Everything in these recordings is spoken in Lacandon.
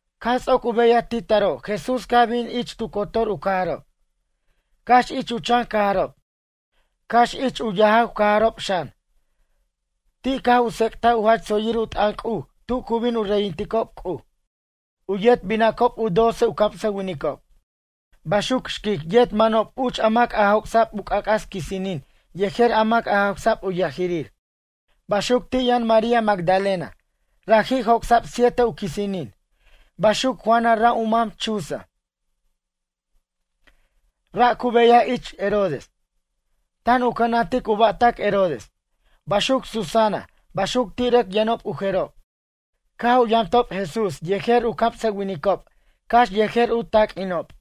Caj ts'oc u beyaj ti taro' Jesús caj bin ich tu cotor u cajarob, cax ich u chan cajarob, cax ich u yajaw cajarob xan. Ti' caj u tsec'taj u jach tsoyir u t'ʌn C'uj tu cu bin u reyinticob C'uj. U yet binacob u doce u camsʌwinicob. Baxuc xquic yet manob uch a mac joc'sa'b u c'ac'as quisinin yejer a mac jawsa'b u yajirir. Baxuc ti' yʌn María Magdalena, raji' joc'sa'b siete u quisinin. Baxuc Juana ra' u mam Chuza, ra' cu beyaj ich Herodes. Tan u cʌnantic u ba'tac Herodes. Baxuc Susana, baxuc ti' rʌc yʌnob u jerob. Caj u yamtob Jesús yejer u camsʌwinicob cax yejer u taq'uinob.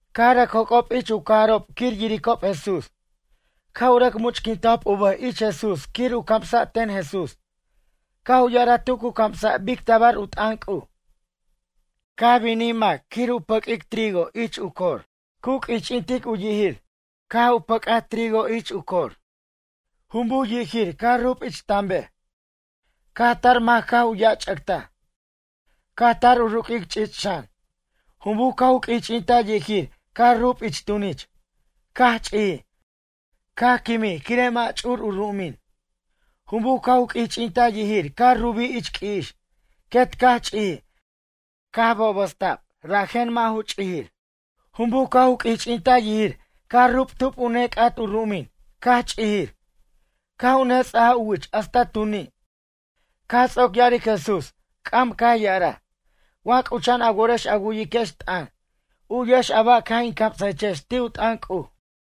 Caj rʌc joc'ob ich u cajarob quir yiricob Jesús. Caj u rʌc much'quintajob u bʌj ich Jesús quir u camsa' ten Jesús. Caj u ya'araj tu cu camsa' bic tabar u t'ʌn C'uj: ―Caj binij mac quir u pʌq'uic tu cor trigo, cu q'uich'intic u yijir. Caj u pʌc'aj u cor trigo, jumbuj yijir caj rub ich tanbej. Caj tar mac caj u yajch'ʌctaj. Caj tar u ruq'uic ch'ich' xan. Jumbuj caj u q'uich'intaj yijir caj rub ich tunich. Caj ch'ijij, caj quimij quire' mʌ' ch'ur u ru'umin. Jumbuj caj u q'uich'intaj yijir caj rubij ich q'ui'ix, quet caj ch'ijij, caj bobasta'b rajen mʌ' ju ch'ijir. Jumbuj caj u q'uich'intaj yijir caj rub tub u nec'at u ru'umin caj ch'ijir caj u nets'aja u wich hasta tu ni'. Caj ts'oc ya'aric Jesús c'am caj ya'araj: ―Wa c'ucha'an a worex a wu'yiquex t'ʌn, u'yex a ba' caj in camsaquechex ti' u t'ʌn C'uj.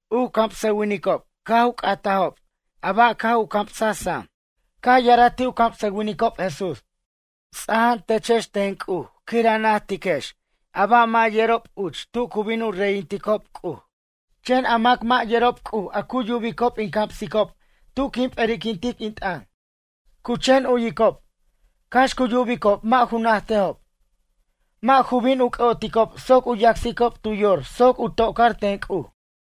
U camsʌwinicob caj u c'atajob ba' caj u camsaj sam. Caj ya'araj ti' u camsʌwinicob Jesús: ―Tsaja'antechex ten C'uj quir a najtiquex a ba' mʌ' yerob uch tu cu bin u reytinticob C'uj. Chen a mac mʌ' yerob C'uj a cu yubicob in camsicob tu quin p'eri'quintic in t'ʌn. Cu chen u'yicob, cax cu yubicob mʌ' ju najtejob. Mʌ' ju bin u c'ʌ'oticob soc u yacsicob tu yor soc u tocar ten C'uj.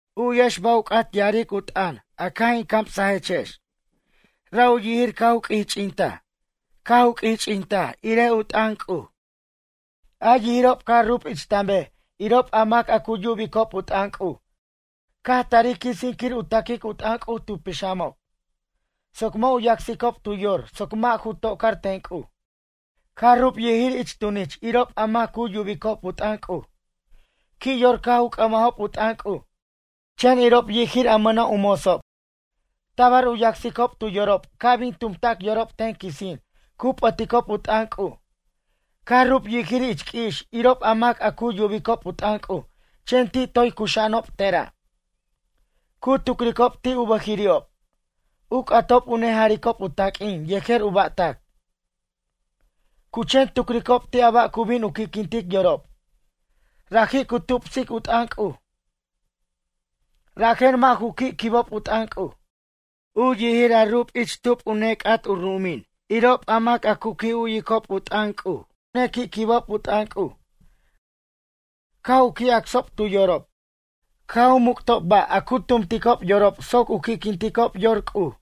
’U'yex ba' u c'at ya'arej u t'ʌn a caj in camsajechex: Ra' u yijir caj u q'uich'intaj caj u q'uich'intaj irej u t'ʌn C'uj. A yijirob caj rub ich tanbej irob a mac a cu yubicob u t'ʌn C'uj caj tarij quisin quir u taquic u t'ʌn C'uj tu pixamob soc mʌ' u yacsicob tu yor soc mʌ' ju tocar ten C'uj. Caj rub yijir ich tunich irob a mac cu yubicob u t'ʌn C'uj. Qui' yor caj u c'ʌmajob u t'ʌn C'uj. Chen irob yijir a mʌna' u motsob. Tabar u yacsicob tu yorob, ca' bin tumta'c yorob ten quisin cu p'ʌticob u t'ʌn C'uj. Caj rub yijir ich q'ui'ix irob a mac a cu yubicob u t'ʌn C'uj chen ti' toy cuxa'anob tera'. Cu tucricob ti' u bʌjiri'ob, u c'atob u nejaricob u taq'uin yejer u ba'tac. Cu chen tucricob ti' a ba' cu bin u qui'quintic yorob. Raji' cu tupsic u t'ʌn C'uj, rajen mʌ' ju qui' quibob u t'ʌn C'uj. U yijir a rub ich tub u nec'at u ru'umin irob a mac a cu qui' yubicob u t'ʌn C'uj caj u nequi' quibob u t'ʌn C'uj. Caj u qui' acsob tu yorob. Caj u muc'tob ba' a cu tumticob yorob soc u qui'quinticob yor C'uj.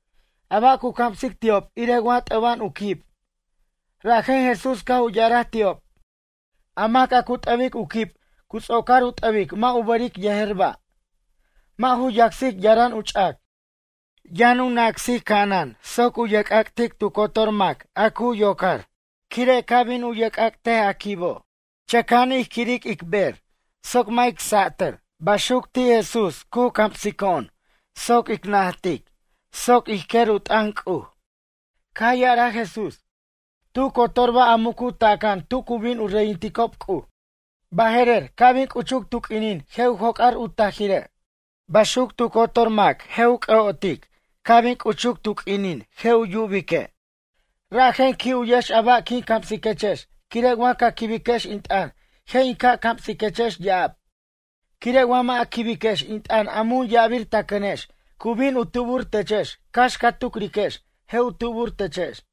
A ba' cu camsic ti'ob irej wa t'ʌba'an u quib, rajen Jesús caj u ya'araj ti'ob: ―A mac a cu t'ʌbic u quib cu ts'ocar u t'ʌbic mʌ' u bʌric yejer ba'. Mʌ' ju yacsic yaram u ch'ac. Yʌn nacsic ca'anan soc u yerc'ac'tic tu cotor mac a cu yocar. Quire' ca' bin u yerc'ac'tej a quibo', chʌca'an ij quirej ic bej soc mʌ' jic satʌr, baxuc ti' Jesús cu camsico'on soc ic najtic ca' ij quer u t'ʌn C'uj. Caj ya'araj Jesús: ―Tu cotor ba' a mucu taca'an tu cu bin u reyinticob C'uj. Baje'rer ca' bin c'uchuc tu q'uinin je' u joc'ar u tajire'. Baxuc tu cotor mac je' u c'ʌ'otej ca' bin c'uchuc tu q'uinin je' u yubique'. ’Rajen qui' u'yex a ba' quin camsiquechex quire' wa ca quibiquex in t'ʌn je' in ca' camsiquechex ya'ab. Quire' wa mʌ' a quibiquex in t'ʌn a mun ya'abir ta cʌnex cu bin u tubur techex cax ca tucriquex je' u tubur techex.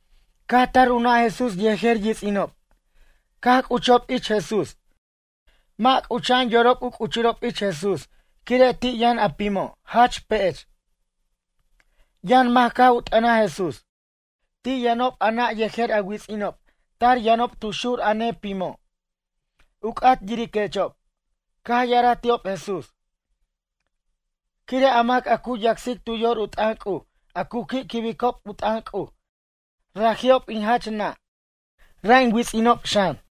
Caj tar u nʌ' Jesús yejer yits'inob. Caj c'uchob ich Jesús. Mʌ' c'ucha'an yorob u c'uchurob ich Jesús quire' ti' yʌn a pimo', jach pech. Yʌn mac caj u t'ʌnaj Jesús: ―Ti' yʌnob a nʌ' yejer a wits'inob tar yʌnob tu xur a nepimo', u c'at yiriquechob. Caj ya'araj ti'ob Jesús: ―Quire' a mac a cu yacsic tu yor u t'ʌn C'uj a cu qui' quibicob u t'ʌn C'uj raji'ob in jach nʌ', ra' in wits'inob xan.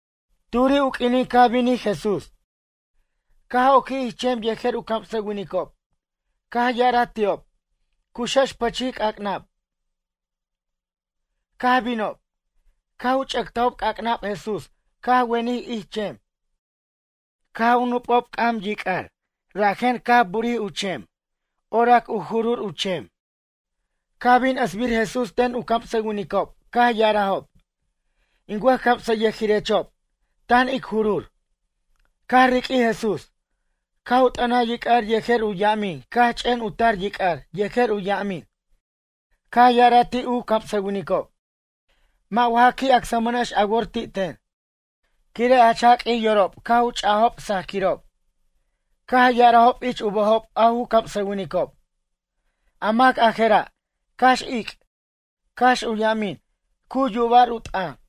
Turi' u q'uinin caj binij Jesús. Caj oquij ich chem yejer u camsʌwinicob. Caj ya'araj ti'ob: ―Cuxex pʌchij c'ac'nab. Caj binob. Caj u ch'ʌctajob c'ac'nab Jesús caj wenij ich chem. Caj u nup'ob c'am yic'ar rajen caj u burij u chem, orac u jurur u chem. Caj bin ʌsbir Jesús ten u camsʌwinicob caj ya'arajob: ―In wʌjcamsayʌjirechob, tan ic jurur. Caj riq'uij Jesús. Caj u t'ʌnaj yic'ar yejer u yamin caj ch'en u tar yic'ar yejer u yamin. Caj ya'araj ti' u camsʌwinicob: ―Mʌ' wa ja qui' acsmʌnex a wor ti' ten? Quire' jach jaq'uij yorob caj u ch'ajob sajquirob. Caj ya'arajob ich u bʌjob a ju camsʌwinicob: ―A mac a je'ra', cax ic', cax u yamin, cu yuba'r u t'ʌn?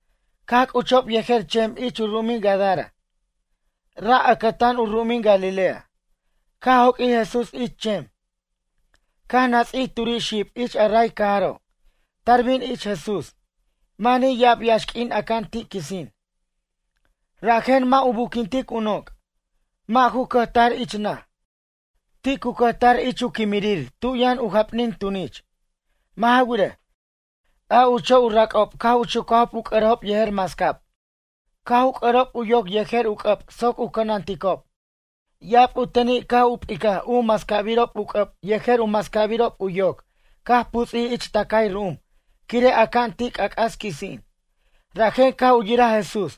Caj c'uchob yejer chem ich u ru'umin Gadara. Ra' ʌcʌtan u ru'umin Galilea. Caj joq'uij Jesús ich chem. Caj nats'ij turi' xib ich a ray cajaro', tar bin ich Jesús. Manij ya'ab yaxq'uin aca'an ti' quisin. Rajen mʌ' u buquintic u noc', mʌ' ju cʌjtar ich naj. Ti' cu cʌjtar ich u quimirir tu yʌn u japnin tunich. Mʌ' ja wirej, a ucho' u rac'ob caj u chucajob u c'ʌrejob yejer mascab. Caj u c'ʌrob u yoc yejer u c'ʌb soc u cʌnanticob, ya'ab u teni' caj u p'icaj u mascabirob u c'ʌb yejer u mascabirob u yoc caj puts'ij ich tʌcay ru'um quire' aca'an ti' c'ac'as quisin. Rajen caj u yiraj Jesús,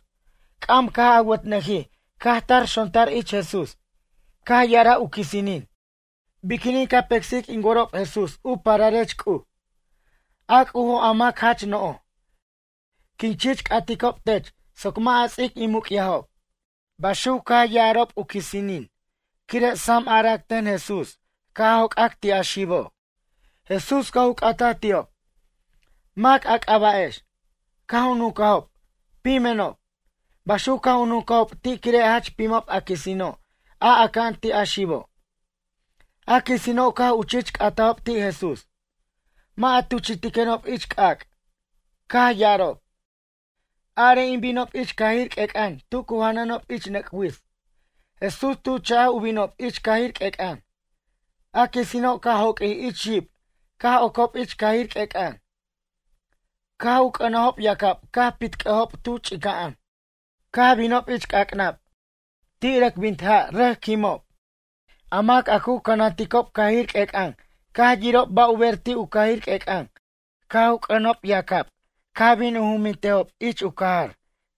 c'am caj awʌtnʌjij caj tar xontar ich Jesús. Caj ya'araj u quisinin: ―Biquinin ca pecsic in worob Jesús u pararech C'uj, a C'ujo' a mac jach no'j? Quin chich c'aticob tech soc mʌ' a ts'ic in muc'yajob. Baxuc caj ya'arob u quisinin quire' sam arac ten Jesús ca' jocac ti' a xibo'. Jesús caj u c'ataj ti'ob: ―Mac a c'aba'ex? Caj u nuncajob: ―Pimenob. Baxuc caj u nuncajob ti' quire' jach pimob a quisino' a aca'an ti' a xibo'. A quisino' caj u chich c'atajob ti' Jesús: ―Mʌ' a tuchi'tiquenob ich c'ac'. Caj ya'arob: ―Are in binob ich cajir q'uec'an tu cu janʌnob ich nʌc' wits. Jesús tu chaj u binob ich cajir q'uec'an. A quisino', caj joq'uij ich xib caj ocob ich cajir q'uec'an, caj u c'ʌnajob yacab caj pitc'ʌjob tu ch'ica'an, caj binob ich c'ac'nab, ti' rʌc bint ja' rʌc quimob. A mac a cu cʌnanticob cajir q'uec'an caj yirob ba' u ber ti' u cajir q'uec'an caj u c'ʌnob yacab caj bin u jumbintajob ich u cajar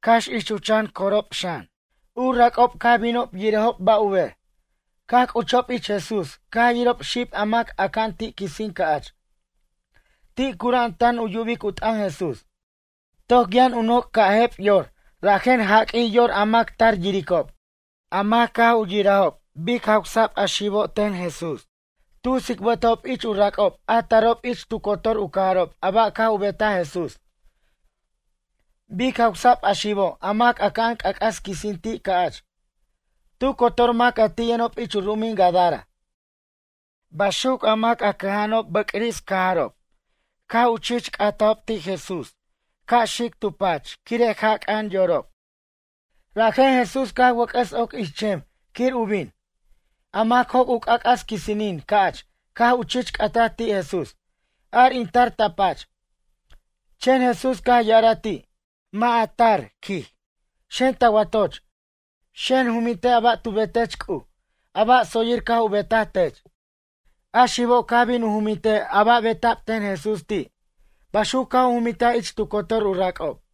cax ich u chan corob xan. U rac'ob caj binob yirejob ba' u ber. Caj c'uchob ich Jesús caj yirob xib a mac aca'an ti' quisin ca'ch. Ti' cura'an tan yubic u t'ʌn Jesús. Toc yʌn u noc' caj jep yor rajen jaq'uij yor a mac tar yiricob. A mac caj u yirajob bic jawsa'b a xibo' ten Jesús. Tu tsicbʌtajob ich u rac'ob a tarob ich tu cotor u cajarob a ba' caj u betaj Jesús, bic jawsa'b a xibo' a mac aca'an c'ac'as quisin ti' ca'ch. Tu cotor mac a ti' yʌnob ich u ru'umin Gadara. Baxuc a mac a cʌja'anob bʌcris cajarob caj u chich c'atajob ti' Jesús ca' xic tu pach quire' jaca'an yorob. Rajen Jesús caj wʌc'ʌs oc ich chem quir u bin. A mac joc' u c'ac'as quisinin ca'ch caj u chich c'ataj ti' Jesús: ―Ar in tar ta pach. Chen Jesús caj yaraj ti': ―Mʌ' ja tar ―quij―. Xen ta watoch, xen jumintej a ba' tu betech C'uj, a ba' tsoyir caj u betaj tech. A xibo' caj bin u jumintej a ba' beta'b ten Jesús ti'. Baxuc caj u jumintaj ich tu cotor u rac'ob.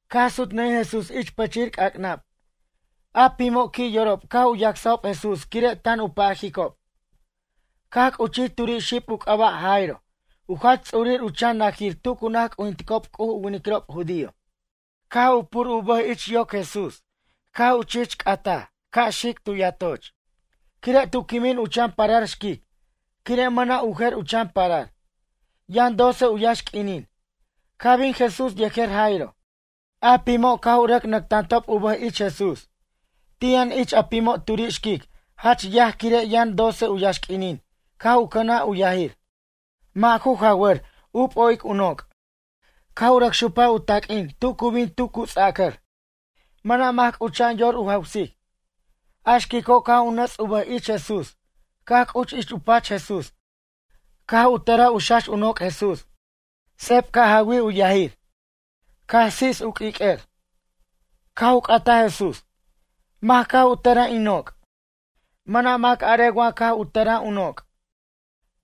Caj sutnʌjij Jesús ich pʌchir c'ac'nab. A pimo' qui' yorob caj u yasajob Jesús quire' tan u pajicob. Caj c'uchij turi' xib u c'aba' Jairo, u jach ts'urir u chan najir tu cu naj c'ujinticob C'uj u winiquirob judío. Caj u pur u bʌj ich yoc Jesús caj u chich c'atej ca' xic tu yatoch. Quire' tu quimin u chan parar xquic quire' mʌna' u jer u chan parar. Yʌn doce u yaxq'uinin. Caj bin Jesús yejer Jairo. A pimo' caj u rʌc nʌctantob u bʌj ich Jesús. Ti' yʌn ich a pimo' turi' xquic jach yaj quire' yʌn doce u yaxq'uinin caj u cʌnaj u yajir. Mʌ' ju jawʌr u p'o'ic u noc'. Caj u rʌc xupaj u taq'uin tu cu bin tu cu ts'acʌr. Mʌna' mac c'ucha'an yor u jawsic. A xquico' caj u nʌts u bʌj ich Jesús caj c'uch ich u pach Jesús caj u tʌraj u xax u noc' Jesús. Sep caj jawij u yajir. Caj tsits u q'uiq'uer. Caj u c'ataj Jesús: ―Mac caj u tʌraj in noc'? Mʌna' mac arej wa caj u tʌraj u noc'.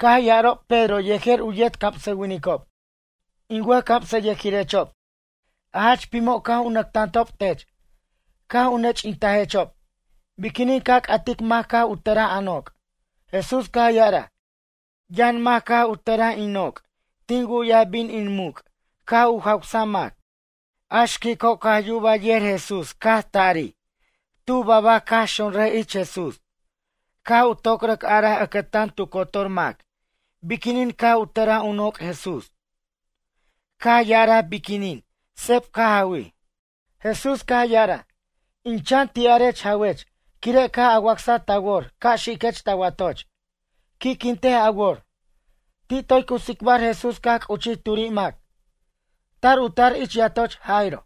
Caj ya'arob Pedro yejer u yetcamsʌwinicob: ―In wʌjcamsʌyʌjirechob, a jach pimo' caj u nʌctantob tech, caj u nech'intajechob. Biquinin ca c'atic mac caj u tʌraj a noc'? Jesús caj ya'araj: ―Yʌn mac caj u tʌraj in noc', tin wu'yaj bin in muc' caj u jawsa'b mac. A xquico' caj yubaj yer Jesús caj tari, tu babac caj xonraj ich Jesús caj u toc rʌc araj ʌcʌtan tu cotor mac biquinin caj a tʌraj u noc' Jesús. Caj ya'araj biquinin seb caj jawij. Jesús caj ya'araj: ―In chan ti'arech jawech quire' caj a wacsa ta wor ca' xiquech ta watoch, qui'quintej a wor. Ti' toy cu tsicbar Jesús caj c'uchij turi' mac, tar u tar ich yatoch Jairo.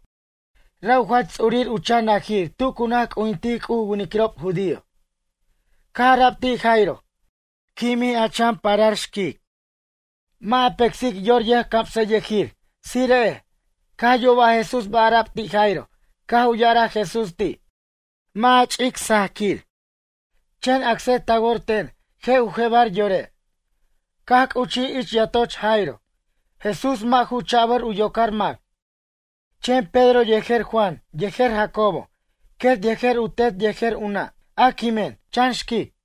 Ra' u jach ts'urir u chan najir tu cu naj c'ujintic C'uj u winiquirob judío. Caj ara'b ti' Jairo: ―Quimij a chan parar, xquic. Mʌ' a pecsic yor yʌjcamsʌyʌjir, tsire'ej. Caj yuba Jesús ba' ara'b ti' Jairo caj u ya'araj Jesús ti': ―Mʌ' a ch'ic sajaquir, chen acsej ta wor ten je' u jebar yore'. Caj c'uchij ich yatoch Jairo. Jesús mʌ' ju chabʌr u yocar mac, chen Pedro yejer Juan yejer Jacobo, quet yejer u tet yejer u nʌ', a quimen, chan xquic.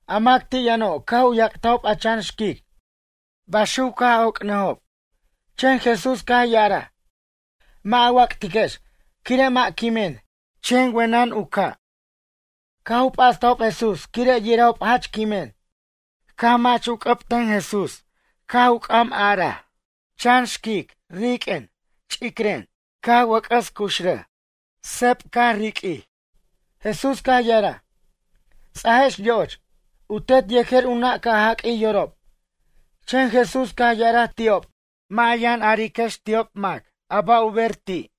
A mac ti' yʌno' caj u yac'tajob a chan xquic baxuc caj oc'arnʌjob. Chen Jesús caj ya'araj: ―Mʌ' a wac'tiquex quire' mʌ' quimen, chen wenen u ca'. Caj u p'astajob Jesús quire' yirajob jach quimen. Caj u mʌch u c'ʌb ten Jesús caj u c'am ya'araj: ―Chan xquic riq'uen ch'icren. Caj u wʌc'ʌs cuxrʌj. Seb caj riq'uij. Jesús caj ya'araj: ―Ts'ajex yo'och. U tet yejer u nʌ' caj jaq'uij yorob. Chen Jesús caj ya'araj ti'ob: ―Mʌ' a yʌn ariquex ti'ob mac a ba' u ber ti'.